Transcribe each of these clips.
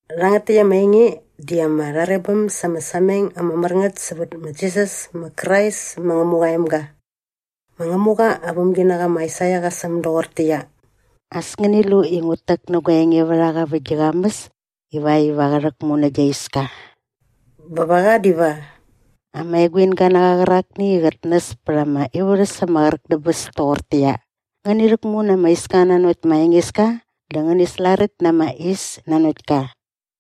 Rhangät täkt ama enge di ama rharebäm sa ama sameng ama mär ngät sävät ma Jisas ma Krais ma Ngämuqa aa emga. Ma Ngämuqa aa vämginaqa ma Aisaia qa säm doqortäqyia, “As ngäni lu i ngut täk nä gua engevärhaqa vä gi qamäs ivakt iva qä rhäkmu nä gia iska” bä va qa diva “ama eguinga na qa qärakni i qät näs pät ama ivärhäs ama qräk dä bäs toqortäqyia, ‘Ngäni rhäkmu na ama iska nanokt ma Engeska dä ngäni slaräkt na ama is nanokt ka.’”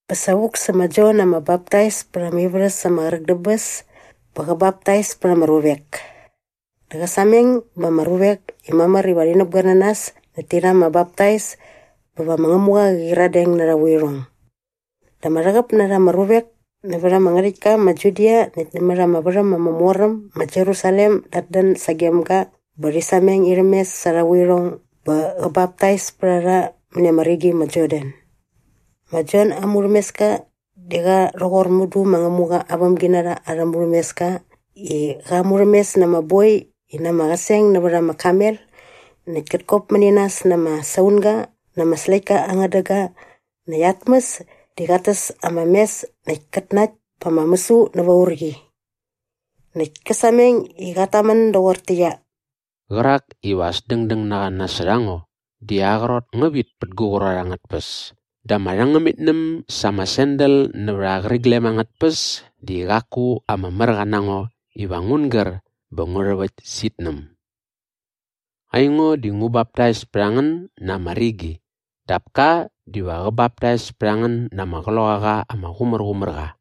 Bä sa vuk sä ma Jon ama Baptais pät ama ivärhäs ama qräk dä bäs bä qä baptais pät ama ruvek. Dä qä sameng ba ama ruvek i mamär iva rhi näpgoer na nas näkt ti rha ama baptais bä va ma Ngämuqa qä qyiradeng na arha vuirhong. Dä ama rhäqäp na rha ama ruvek nävät ama ngärhäktka ma Judia näkt nämät ama värhäm ama mor äm ma Jerusalem dat dän sagem ga bä rhi sameng irhäm mes sa arha vuirhong bä qä baptais pät a rha mäni ama rigi ma Jordan. Ma Jon aa murhämeska di qa rhoqor mudu ma Ngämuqa aa vämginarha arhä murhämeska i qa murhämes na ama boi i na ama qäseng nävät ama kamel näkt kät kop mäni nas na ama saunga na ama släktka aa ngädäga näkt aa tmäs di qat täs ama mes näkt kät nakt pa ama mäsu näva urqi. Näkt kä sameng i qat tamän doqortäqyia, “Qärak iva as dängdäng na qa nasot a ngo di aa qrot ngä vit pä gu qrot angät tpäs dä ama rhängämitnäm sa ama sandal nävät aa qäriglem angät tpäs di qaku ama märqa na ngo iva ngun gär bä ngu rhäväkt sä itnäm. Aingo di ngu baptais pät a ngän na ama rigi dap ka diva qä baptais pät a ngän na ama Qloqaqa ama Qumärqumärqa.”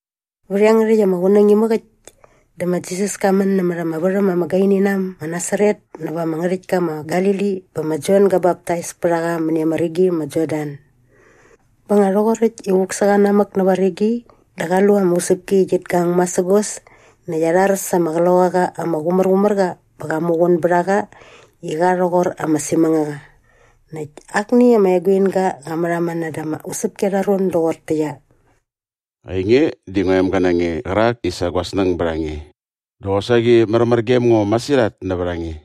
Vät iangärhäkt ama qunäng imäk äkt dä ma Jisas ka män nämät ama värhäm ama gaini na äm ma Nasaret näva ama ngärhäktka ma Galili bä ma Jon gä baptais pät a qa mäni ama rigi ma Jordan. Bä nga rhoqoräkt i vuk sä qa namäk näva rigi dä qa lu ama usäpki i qit gang masägos näkt arhar sa ama Qloqaqa ama Qumärqumärqa bä qa muqun bät a qa i qa rhoqor ama simängaqa. Näkt akni ama eguinga qa märhamän näda ama usäpki arha ron doqortäqyia, “Ainge di ngua emga na nge qärak i sa gua snäng bät a nge dä qosaqi märmär gem ngo masirhat nävät a nge.”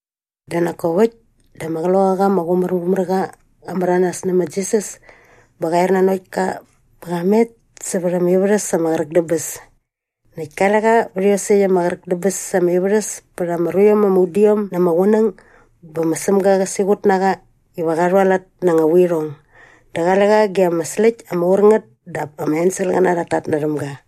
Dä nak kop äkt dä ama Qloqaqa ama Qumärqumärqa qa märanas nä ma Jisas bä qa er nanokt ka bä qa met sävät ama ivärhäs ama qräk dä bäs. Näkt kale qa vät iosäkt ama qräk dä bäs ama ivärhäs pät ama ruiom ama udiom na ama qunäng bä ma Sämga qa siqut na qa iva qa rhualat na anga vuirhong dä qale qa ge ama släkt ama ur ngät dap ama enselqäna rhat tatnärhäm ga.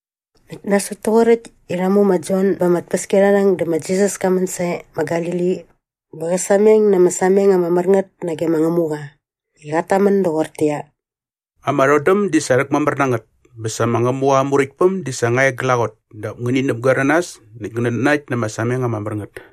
Näkt nasot toqoräkt i rha mu ma Jon ba ama tpäskiarharhäng dä ma Jisas ka män sae ma Galili bä qä sameng na ama sameng ama mär ngät nage ma Ngämuqa i qat tamän doqortäqyia, “Ama rhodäm di sa rhäkmamär na ngät bä sa ma Ngämuqa aa Muräktpäm di sa nga e glaqot dap ngäni näpgoer na nas näkt ngänät nanakt na ama sameng ama mär ngät.”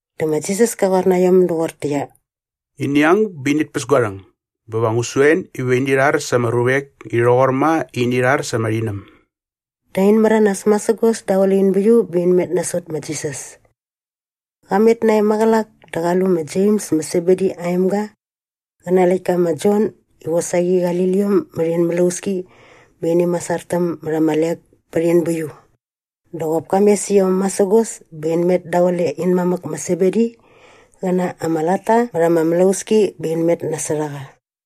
Dä ma Jisas ka qoar na iom doqortäqyia, “Ini ang bä init päs gua rhäng bä va ngu su en iva ini rhar sa ama ruvek i rhoqor ma i ini rhar sa ama rhinäm.” Dä in märanas masägos daqule in bäiu bä in met nasot ma Jisas. Qa met nae maqälak dä qa lu ma Jems ma Sebedi aa emga qä na aa läktka ma Jon i qosaqi qali liom mät in mlauski bä ini masartäm mät ama lek pät in bäiu. Dä qop ka mes iom masägos bä in met daqule in mamäk ma Sebedi qä na ama latta mät ama mlauski bä in met nasot a qa.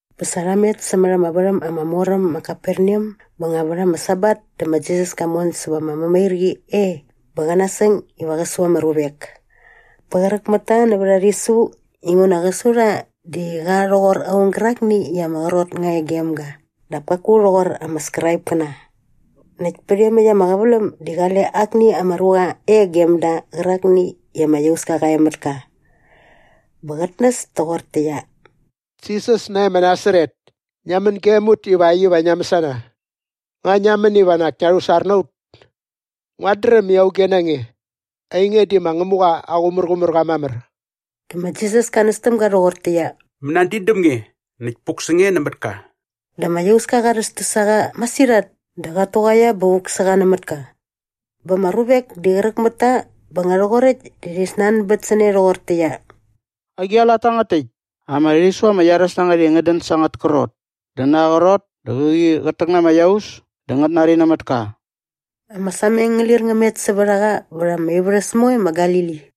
Bä sa rha met sämät ama värhäm ama mor äm ma Kaperneam bä nga vät ama Sabat dä ma Jisas ka mon säva ama mämairqi e bä qa nasäng iva qä su ama ruvek. Bä qräk mät ta nävät aa rhisu inguna qä su rha di qa rhoqor aung gärakni i ama qrot nga e gem ga dap kaku rhoqor ama Skraipkäna. Näkt pät iomäkt ama qäväläm di qale akni ama ruqa e gem da qärakni i ama iauska qa e mät ka. Bä qät näs toqortäqyia, “Jisas nae ma Nasaret, ngia män gem ut ivakt iva ngia mäsana? Nga ngia män iva nak ngia rhusar na ut? Nguat dräm i auge na nge. Ainge di ma Ngämuqa aa Qumärqumärqa mamär.” Dä ma Jisas ka näs täm ga rhoqortäqyia, “Mänadin däm nge näkt puk sä nge nämät ka.” Dä ama iauska qa rhästäs a qa masirhat dä qat tuqaia bä vuk sä qa nämät ka. Bä ama ruvek di qräk mät ta bä nga rhoqoräkt dä rhi snanbät sä ne rhoqortäqyia, “Agi aa lat tangät täkt? Ama rhisu ama iaräs na ngät i ngät dän sa angät krot! Dä na aa qrot dä qäqi qät täk na ama iaus dä ngät nari nämät ka.” Ama sameng ngä lir ngä met sävät a qa vät ama ivärhäs moe ma Galili.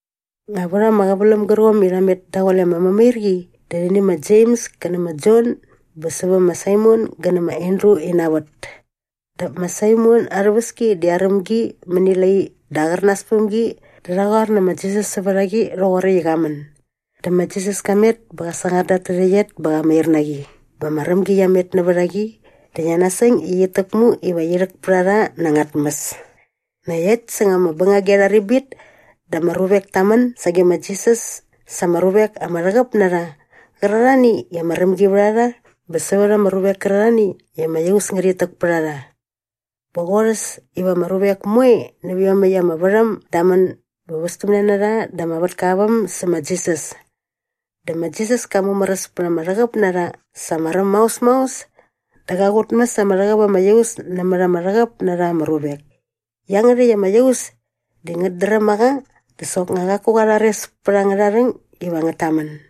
Nga vät ama qäväläm gärqomni i rha met daqule ama mämairqi di rhi nä ma Jems kä nä ma Jon bä sävä ma Saimon gä nä ma Andru ina vät. Dap ma Saimon aa rhäväski di aräm gi mäni lai dä aqärnas päm gi dä rha qoar nä ma Jisas sävät a qi rhoqoräkt i qa män. Dä ma Jisas ka met bä qa sangar da at tärhäqyet bä qa mair na qi bä ama rämgi qia met nävät a qi dä qia nasäng i qit täkmu iva qi rhäk pät a rha na anga tmäs. Näkt äkt säng ama bängagi arha ribit dä ama ruvek ta män sage ma Jisas sa ama ruvek ama rhäqäp na rha qärarhani i ama rämgi vät a rha bä sävät ama ruvek kärarhani i ama iaus ngärhit täk pät a rha. Bä qorhäs iva ama ruvek moe nävä iomäkt ama värhäm da män bä västämne na rha da ama vätka aa väm sä ma Jisas. Dä ma Jisas ka mumäräs pät ama rhäqäp na rha sa ama räm maos maos dä qa qutmäs ama rhäqäp ama iaus nämät ama rhäqäp na rha ama ruvek. Iangärhäkt ama iaus di ngät dräm a qa dä soknga qaku qa rhares pät angärha rhäng iva ngät tamän.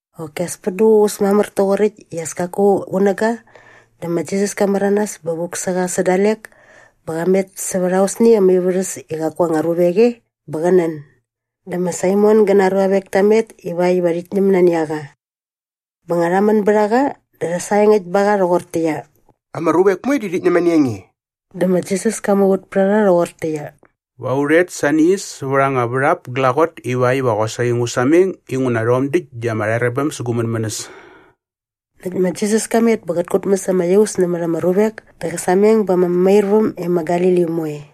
Qoki as pät duququs mamär toqoräkt i as kaku qunäga dä ma Jisas ka märanas bä vuk sä qa sä dalek bä qa met sävät aosni ama ivärhäs i qaku anga ruvek e bä qä nän. Dä ma Saimon gä na aa ruavek ta met ivakt iva rhit ñäm nani a qa. Bä nga rha män bät a qa dä rha saengäkt ba qa rhoqortäqyia, “Ama ruvek moe di rhit ñäm nani a nge.” Dä ma Jisas ka muvät pät a rha rhoqortäqyia, “Va u rhet sa ni as säva anga värhap glaqot ivakt iva qosaqi ngu sameng inguna rhom däkt di ama rharebäm sä gu mänmänäs.” Näkt ma Jisas ka met bä qät kutmäs ama iaus nämät ama ruvek dä qä sameng ba ama mämairväm e ma Galili moe.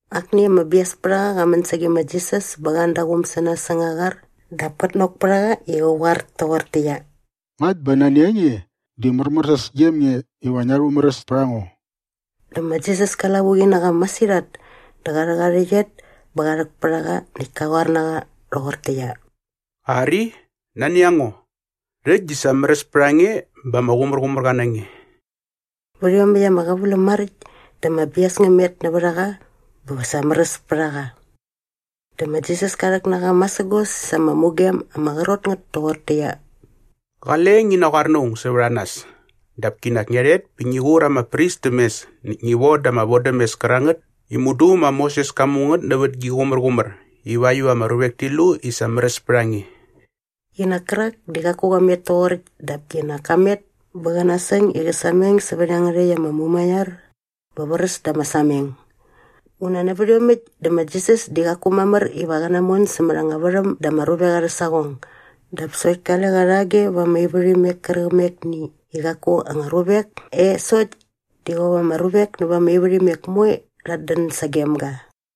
Akni ama biaspärhaqa qa män sage ma Jisas bä qa an da aa quum sä nas säng aa qar dap kät nok pät a qa i qä qoar toqortäqyia, “Ngakt bä nani a nge di märmärsäs gem nge iva ngia rhumäräs pät a ngo.” Dä ma Jisas ka lavuqi na qa masirhat dä qa rhäk aa rhäqyet bä qa rhäk pät a qa näkt ka qoar na qa rhoqortäqyia, “Ari, nani a ngo. Rhäkt di sa märäs pät a nge bä ama qumärqumärqa na nge.” Vät iomäkt ama qäväläm maräkt dä ama bias ngä met nävät a qa bä sa märäs pät a qa. Dä ma Jisas ka rhäk na qa masägos sa ama mugem ama qrot ngät toqortäqyia, “Qale ngi naqoar na aung sävät a nas dap kinak ngia rhet bä ngi qur ama pris täm mes näkt ngi voda ama vodämes kärangät i mudu ma Moses ka mu ngät nävät gi qumärqumär ivakt iva ama ruvek ti lu i sa märäs pät a nge.” Qinak kärak di qaku qa met toqoräkt dap kinak ka met bä qä nasäng i qä sameng sävät iangärhäkt ama mumaiar bä vräs da ama sameng. Nguna nävät iomäkt dä ma Jisas di qaku mamär iva qä namon sämät anga värhäm da ama ruvek arhä saqong dap sokt kale qa rhage va ama ivärhimek kärqämekni i qaku anga ruvek e sokt di qop ama ruvek nävät ama ivärhimek moe rhat dän sagem ga.